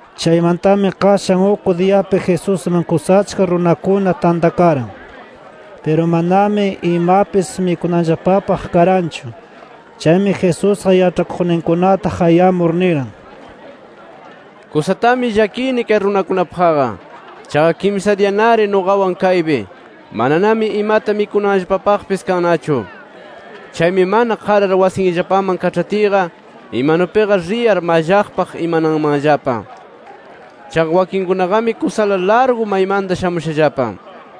Chaymantami qashan uk diyapi Jesusman kusa achka runakuna tantakaran. Piru manami imapis mikunanllapapaq karanchu. Chaymi Jesusqa yaĉhakuqninkunata qayamur niran: —Kusatami llakini kay runakunapaqqa. Chaqa kimsa diyanari nuqawan kaypi. Mananami imata mikunanllapapaqpis kannachu. Chaymi mana qarar wasinllapaman kaĉhatiyqa, imanupiqa riyar mallaqpaq imananmanllapa. Chaqa wakinkunaqami kusala largu maymanta shamushallapa.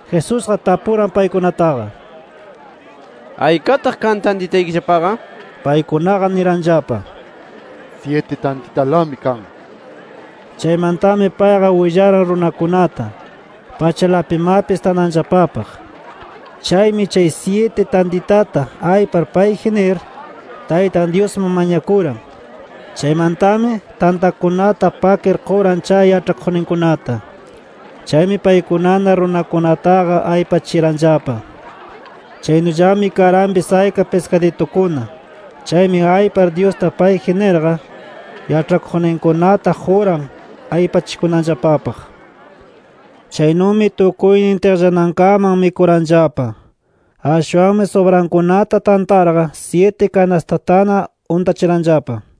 Jesusqa tapuran paykunataqa: —¿Aykataq kan tantitaykillapaqa? nir. Paykunaqa niranllapa: —Syiti tantitalami kan nir. Chaymantami payqa willaran runakunata, pachalapimapis tananllapapaq. Chaymi, chay syiti tantitata aypar payji nir, Taytan Dyusman mañakuran. Chaymantami, tantakunata pakir quran chay yaĉhakuqninkunata. Chaymi paykunana runakunataqa aypachiranllapa. Chaynullami karanpis ayka piskaditukuna. Chaymi aypar Dyusta payji nirqa, yaĉhakuqninkunata quran aypachikunanllapapaq. Chaynumi tukuynin tiqllanankaman mikuranllapa. Ashwanmi subrankunata tantarqa, syiti kanastatana untachiranllapa.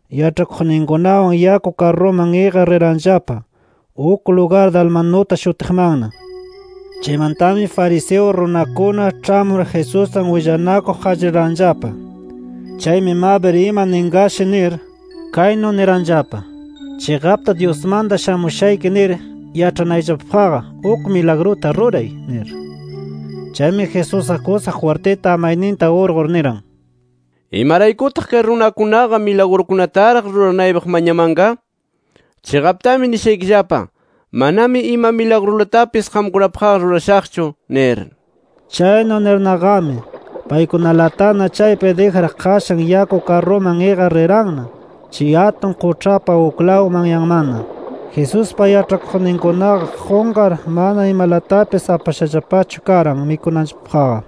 yaĉhakuqninkunawan yaku karruman iqar riranllapa uk lugar Dalmanuta shutiqmanna. Chaymantami fariseo runakuna ĉhamur Jesuswan willanakuq qallariranllapa. Chaymi mabir ima ninqashi nir, kaynu niranllapa: “Chiqapta Dyusmanta shamushayki nir yaĉhanayllapapaqqa uk milagruta ruray” nir. Chaymi Jesusqa kusa jwirtita amayninta urqur, niran: “¿Imaraykutaq kay runakunaqa milagrukunataraq ruranaypaq mañamanqa? Chiqaptami nishaykillapa: Manami ima milagrulamatapis qamkunapaqqa rurashaqchu nir”. Chaynu nirnaqami, paykunalatana chaypi dijar qashan yaku karruman iqar riranna chay atun quĉhapa uklaw manyanmanna. Jesuspa yaĉhakuqninkunaqa qunqar mana imalatapis apashallapachu karan mikunanllapapaqqa.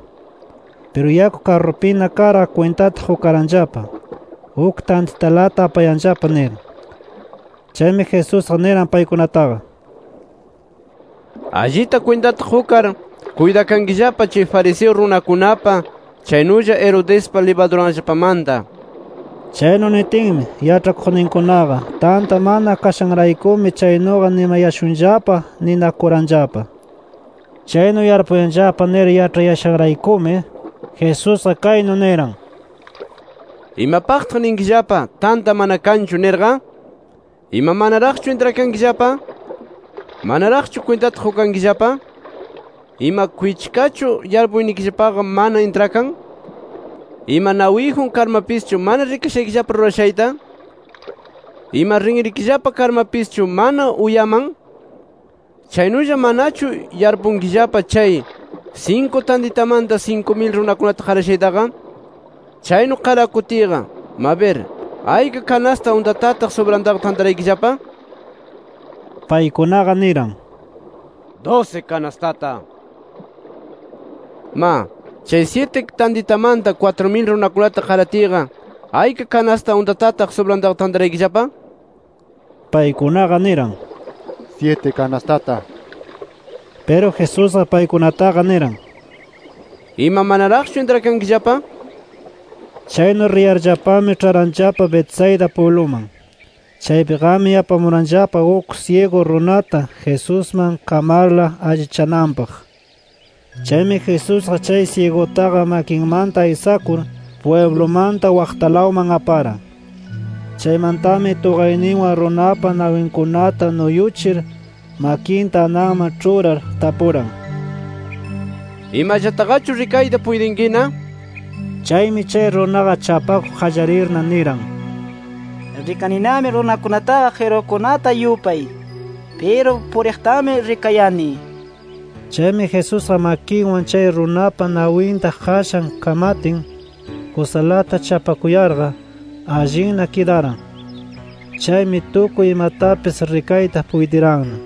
Piru yaku karrupina karqa kwintata qukaranllapa, uk tantitalata apayanllapa nir. Chaymi Jesusqa niran paykunataqa: —Allita kwintata qukar, kuytakankillapa chay fariseo runakunapa, chaynulla Herodespa libaduranllapamanta nir. Chaynu nitinmi, yaĉhakuqninkunaqa, tanta mana kashanraykumi chaynuqa nimayashunllapa ninakuranllapa. Chaynu yarpuyanllapa nir yaĉhayashanraykumi, Jesusqa kaynu niran: —¿Imapaqtaq ninkillapa, tanta mana kanchu? nirqa. ¿Ima manaraqchu intrakankillapa? ¿Manaraqchu kwintata qukankillapa? ¿Ima kwichkachu yarpuynikillapaqa mana intrakan? ¿Ima nawiyjun karmapischu mana rikashaykillapa rurashayta? ¿Ima rinrikillapa karmapischu mana uyaman? Chaynulla ¿mananachu yarpunkillapa chay, sinku tantitamanta sinku mil runakunata qarashaytaqa? Chaynu qarakutiyqa, mabir ¿ayka kanasta untatataq subrantaqa tantaraykillapa? Paykunaqa niran: —Dusi kanastata nir. —Ma, chay syiti tantitamanta kwatru mil runakunata qaratiyqa, ¿ayka kanasta untatataq subrantaqa tantaraykillapa? Paykunaqa niran: —Syiti kanastata nir. Piru Jesusqa paykunataqa niran: —¿Ima manaraqchu intrakankillapa? nir. Chaynu riyarllapami ĉharanllapa Betsaida pwibluman. Chaypiqami apamuranllapa uk syigu runata Jesusman kamarla allichananpaq. Chaymi Jesusqa chay syigutaqa makinmanta aysakur, pwiblumanta waqtalawman aparan. Chaymantami tuqayninwan runapa nawinkunata nuyuchir, makinta ananman ĉhurar, tapuran: —¿Imallataqachu rikayta puytinkina? nir. Chaymi chay runaqa chapakuq qallarirna, niran: —Rikaninami runakunataqa qirukunata yupay. Piru puriqtami rikayani nir. Chaymi Jesusqa makinwan chay runapa nawinta qashan kamatin, kusalata chapakuyarqa, allinna kidaran. Chaymi tukuy imatapis rikayta puytiranna.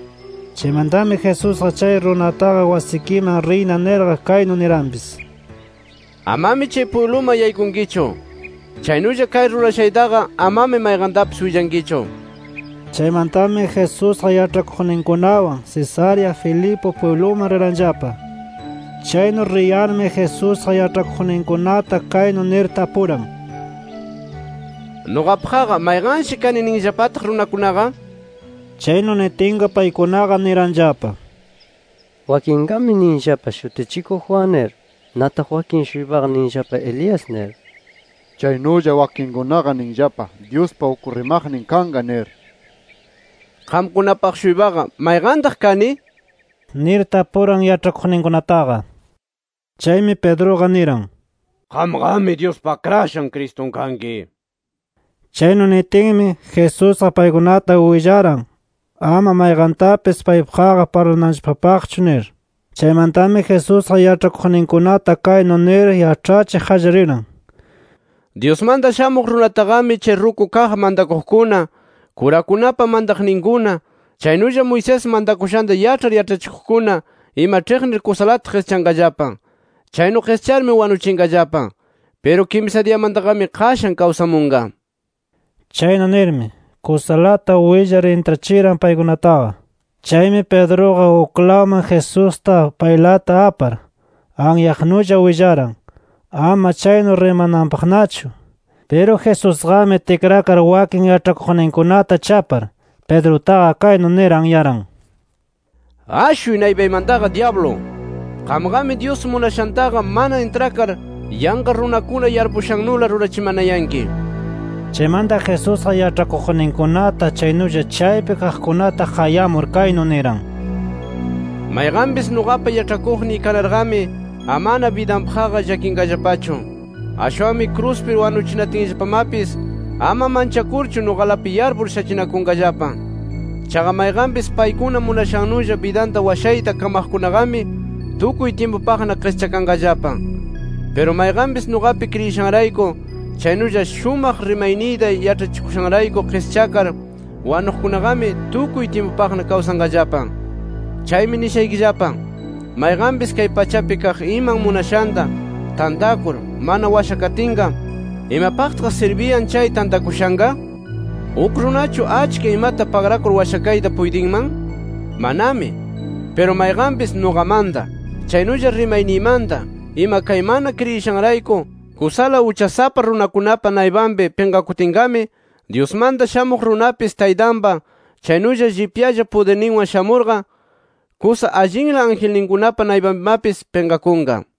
Chaymantami Jesusqa chay runataqa wasikiman riyna nirqa, kaynu niranpis: —Amami chay pwibluman yaykunkichu. [Chaynulla kay rurashaytaqa amami mayqantapis willankichu] nir. Chaymantami Jesusqa yaĉhakuqninkunawan Cesarea Filipo pwibluman riranllapa. Chaynu riyarmi Jesusqa yaĉhakuqninkunata kaynu nir tapuran: —¿Nuqapaqqa mayqanshi kani ninllapataq runakunaqa? nir. Chaynu nitinqa paykunaqa niranllapa: —Wakinqami ninllapa, Shutichikuq Juan nir. Nataq wakin-shuypaqa ninllapa Elías nir. Chaynulla wakinkunaqa ninllapa Dyuspa uk rimaqnin kanqa nir. —Qamkunapaq-shuypaqa, ¿mayqantaq kani? —nir tapuran yaĉhakuqninkunataqa. Chaymi Pedruqa niran: —Qamqami Dyuspa Akrashan Cristun kanki nir. Chaynu nitinmi, Jesusqa paykunata willaran ama mayqantapis paypaqqa parlananllapapaqchu nir. Chaymantami Jesusqa yaĉhakuqninkunata kaynu nir yaĉhachiq qallariran: Dyusmanta Shamuq Runataqami chay ruku kaq mantakuqkuna, kurakunapa mantaqninkuna, chaynulla Moisés mantakushanta yaĉhar yaĉhachikuqkuna ima ĉhiqnir kusalata qischanqallapa. Chaynu qischarmi wanuchinqallapa. Piru kimsa diyamantaqami qashan kawsamunqa nir. Chaynu nirmi, kusalata willar intrachiran paykunataqa. Chaymi, Pedruqa uklawman Jesusta paylata apar, anyaqnulla willaran ama chaynu rimananpaqnachu. Piru Jesusqami tikrakar wakin yaĉhakuqninkunata chapar, Pedrutaqa kaynu nir anyaran: —¡Ashuy naypaymantaqa dyablu! Qamqami Dyus munashantaqa mana intrakar, yanqa runakuna yarpushannula rurachimanayanki nir. Chaymanta Jesusqa yaĉhakuqninkunata chaynulla chaypi kaqkunata qayamur kaynu niran: “Mayqanpis nuqapa yaĉhakuqniy kanarqami amana bidanllapapaqqa llakinqallapanachu. Ashwanmi kruspi wanuchinatinllapamapis ama manchakurchu nuqalapi yarpur shachinakunqallapa. Chaqa mayqanpis paykuna munashannulla bidanta washayta kamaqkunaqami tukuy tyimpupaqna qischakanqallapa. Piru mayqanpis nuqapi kriyishanrayku chaynulla shumaq rimayniyta yaĉhachikushanrayku qischakar wanuqkunaqami tukuy tyimpupaqna kawsanqallapa. Chaymi nishaykillapa: Mayqanpis kay pachapi kaq iman munashanta tantakur mana washakatinqa, ¿imapaqtaq sirbiyan chay tantakushanqa? ¿Uk runachu achka imata pagrakur washakayta puytinman? ¡Manami! Piru mayqanpis nuqamanta chaynulla rimayniymanta ima kay mana kriyishanrayku kusala uchasapa runakunapa naypanpi pinqakutinqami, Dyusmanta Shamuq Runapis Taytanpa kusa llipyalla pudirninwan shamurqa, kusa allinla angelkunapa naypanpimapis pinqakunqa”.